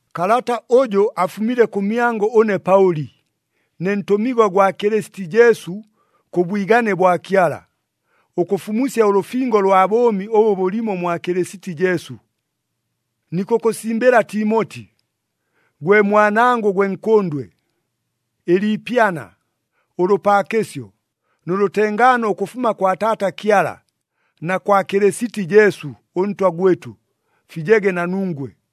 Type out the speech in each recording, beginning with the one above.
Kalata ʉjʉ afumile kʉmyangʉ ʉne Paʉli, ne ntʉmigwa gwa Kɨlɨsiti Jesu kʉ bwigane bwa Kyala, ʉkʉfumusya ʉlʉfingo lwa bʉʉmi ʉbʉ bʉlimo mwa Kɨlɨsiti Jesu. Nikʉkʉsimbɨla Timoti, gwe mwanangʉ gwe nkʉndwe. Ɨliipyana, ʉlʉpaakɨsyo nʉ lʉtengaano ʉkʉfuma kwa Taata Kyala na kwa Kɨlɨsiti Jesu ʉNtwa gwɨtʉ, fijege na nungwe.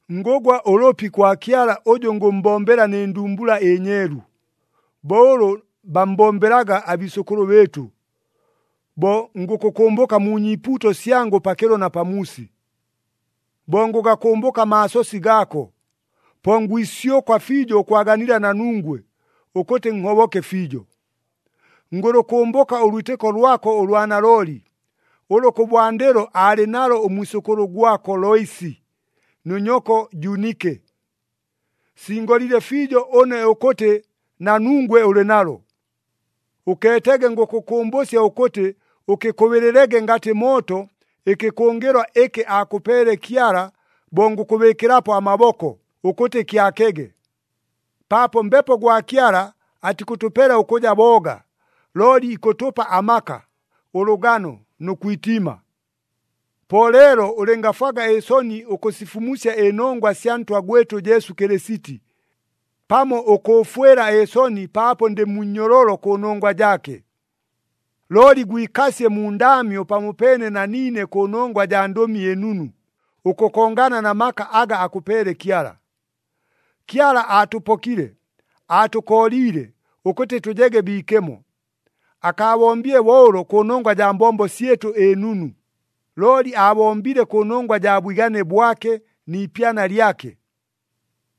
Ngʉgwa ʉlʉpi kwa Kyala ʉjʉ ngʉmmbombela nɨ ndumbula ɨnyeelu, bo ʉlʉ bammbombelaga abiisʉkʉlʉ bɨɨtʉ, bo ngʉkʉkʉmbʉka mu nyiipuuto syangʉ pakɨlo na pamuusi. Bo ngʉgakʉmbʉka amaasosi gaako, po ngwisyʉkwa fiijo ʉkwaganila na nungwe, ʉkʉtɨ nhoboke fiijo. Ngʉlʉkʉmbʉka ʉlwitɨko lwako ʉlwa nalooli, ʉlʉ kʉbwandɨlo aalɨ nalo ʉmwisʉkʉlʉ gwako Loisi nʉ nyoko Junike. Singolile fiijo ʉne ʉkʉtɨ na nungwe ʉlɨ nalo. Ʉkeetege ngʉkʉkʉmbʉsya ʉkʉtɨ, ʉkɨkʉbɨɨlɨlege ngatɨ mooto ɨkɨkʉngɨlwa ɨkɨ aakʉpeele Kyala bo ngʉkʉbɨɨkɨlapo amaboko, ʉkʉtɨ kyakege. Paapo Mbepo gwa Kyala atikʉtʉpela ʉkʉja booga, looli ikʉtʉpa amaka, ʉlʉgano nʉ kwitiima. Po leelo ʉlɨngafwaga ɨsoni ʉkʉsifumusya ɨnongwa sya Ntwa gwɨtʉ Jesu Kɨlɨsiti, pamo ʉkʉʉfwɨla ɨsoni paapo ndɨ mu nnyololo kʉnongwa jaake. Looli gwikasye mu ndaamyo pamopeene na niine kʉnongwa jaa Ndʉmi ɨNunu, ʉkʉkongana na maka aga akʉpeele Kyala. Kyala aatʉpokile, aatʉkooliile ʉkʉtɨ tʉjege biikemo. Akaabombile bo ʉlo kʉnongwa jaa mbombo syɨtʉ ɨnunu, looli aabombile kʉnongwa jaa bwigane bwake ni ipyana lyake.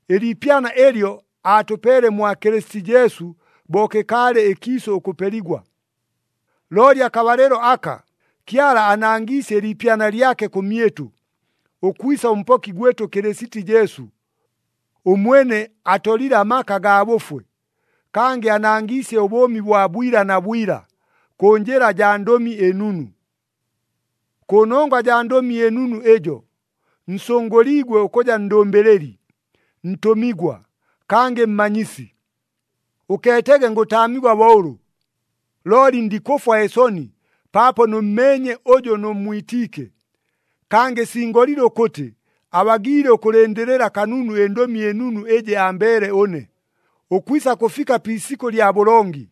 Ɨliipyana ɨlyo aatʉpeele mwa Kɨlɨsiti Jesu bo kɨkaalɨ ɨkiisʉ ʉkʉpeligwa. Looli akabalɨlo aka, Kyala anangiisye ɨliipyana lyake kʉmyɨtʉ, ʉkwisa ʉMpoki gwɨtʉ Kɨlɨsiti Jesu. Ʉmwene atolile amaka gaa bʉfwe, kangɨ anangiisye ʉbʉʉmi bwa bwila na bwila kʉ njɨla jaa Ndʉmi ɨNunu. Kʉnongwa jaa Ndʉmi ɨNunu ɨjo, nsʉngʉliigwe ʉkʉja ndʉmbɨlɨli, ntʉmigwa, kangɨ mmanyisi. Ʉkeetege ngʉtaamigwa bo ʉlʉ. Looli ndikʉfwa ɨsoni paapo nʉmmeenye ʉjʉ nʉmmwitiike, kangɨ singolile ʉkʉtɨ abagiile ʉkʉlɨndɨlɨla kanunu ɨNdʉmi ɨNunu ɨjɨ ambeele ʉne, ʉkwisa kʉfika pi isikʉ lya bʉlongi.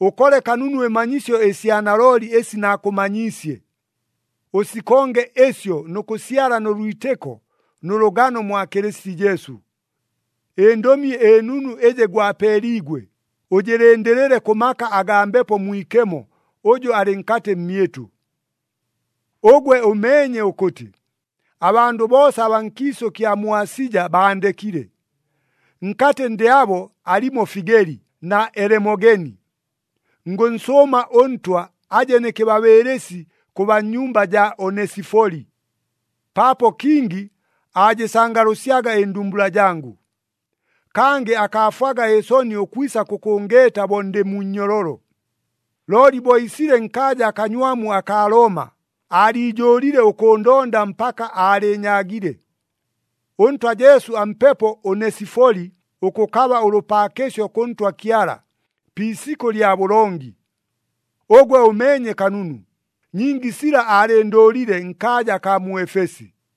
Ʉkole kanunu ɨmanyisyo ɨsya nalooli ɨsi naakʉmanyiisye. Ʉsikonge ɨsyo nʉ kʉsyala nʉ lwitɨko nʉ lʉgano mwa Kɨlɨsiti Jesu. ƗNdʉmi ɨNunu ɨjɨ gwapeeliigwe, ʉjɨlɨndɨlɨle kʉ maka agaa Mbepo Mwikemo ʉjʉ alɨ nkatɨ mmyɨtʉ. Ʉgwe ʉmeenye ʉkʉtɨ, abandʉ boosa abaa nkiisʉ kya mu Asija baandekile. Nkatɨ ndɨ abo alimo Figeli na Elemogeni. Ngʉnsʉʉma ʉNtwa aje nɨ kɨbabɨɨlɨsi kʉ baa mu nyumba jaa Onesifoli, paapo kingi aajɨsangalʉsyaga ɨndumbula jangʉ. Kangɨ akaafwaga ɨsoni ʉkwisa kʉkʉngeeta bo ndɨ mu nnyololo, looli bo iisile nkaaja akanywamu akaa Looma, aaliijʉʉlile ʉkʉʉndonda mpaka aalɨɨnyaagile. ɄNtwa Jesu ampepo Onesifoli ʉkʉkaba ʉlʉpaakɨsyo kʉ Ntwa Kyala, pi isikʉ lya bʉlongi. Ʉgwe ʉmeenye kanunu, nyingi sila aalɨndʉʉlile nkaaja akaa mu Efesi.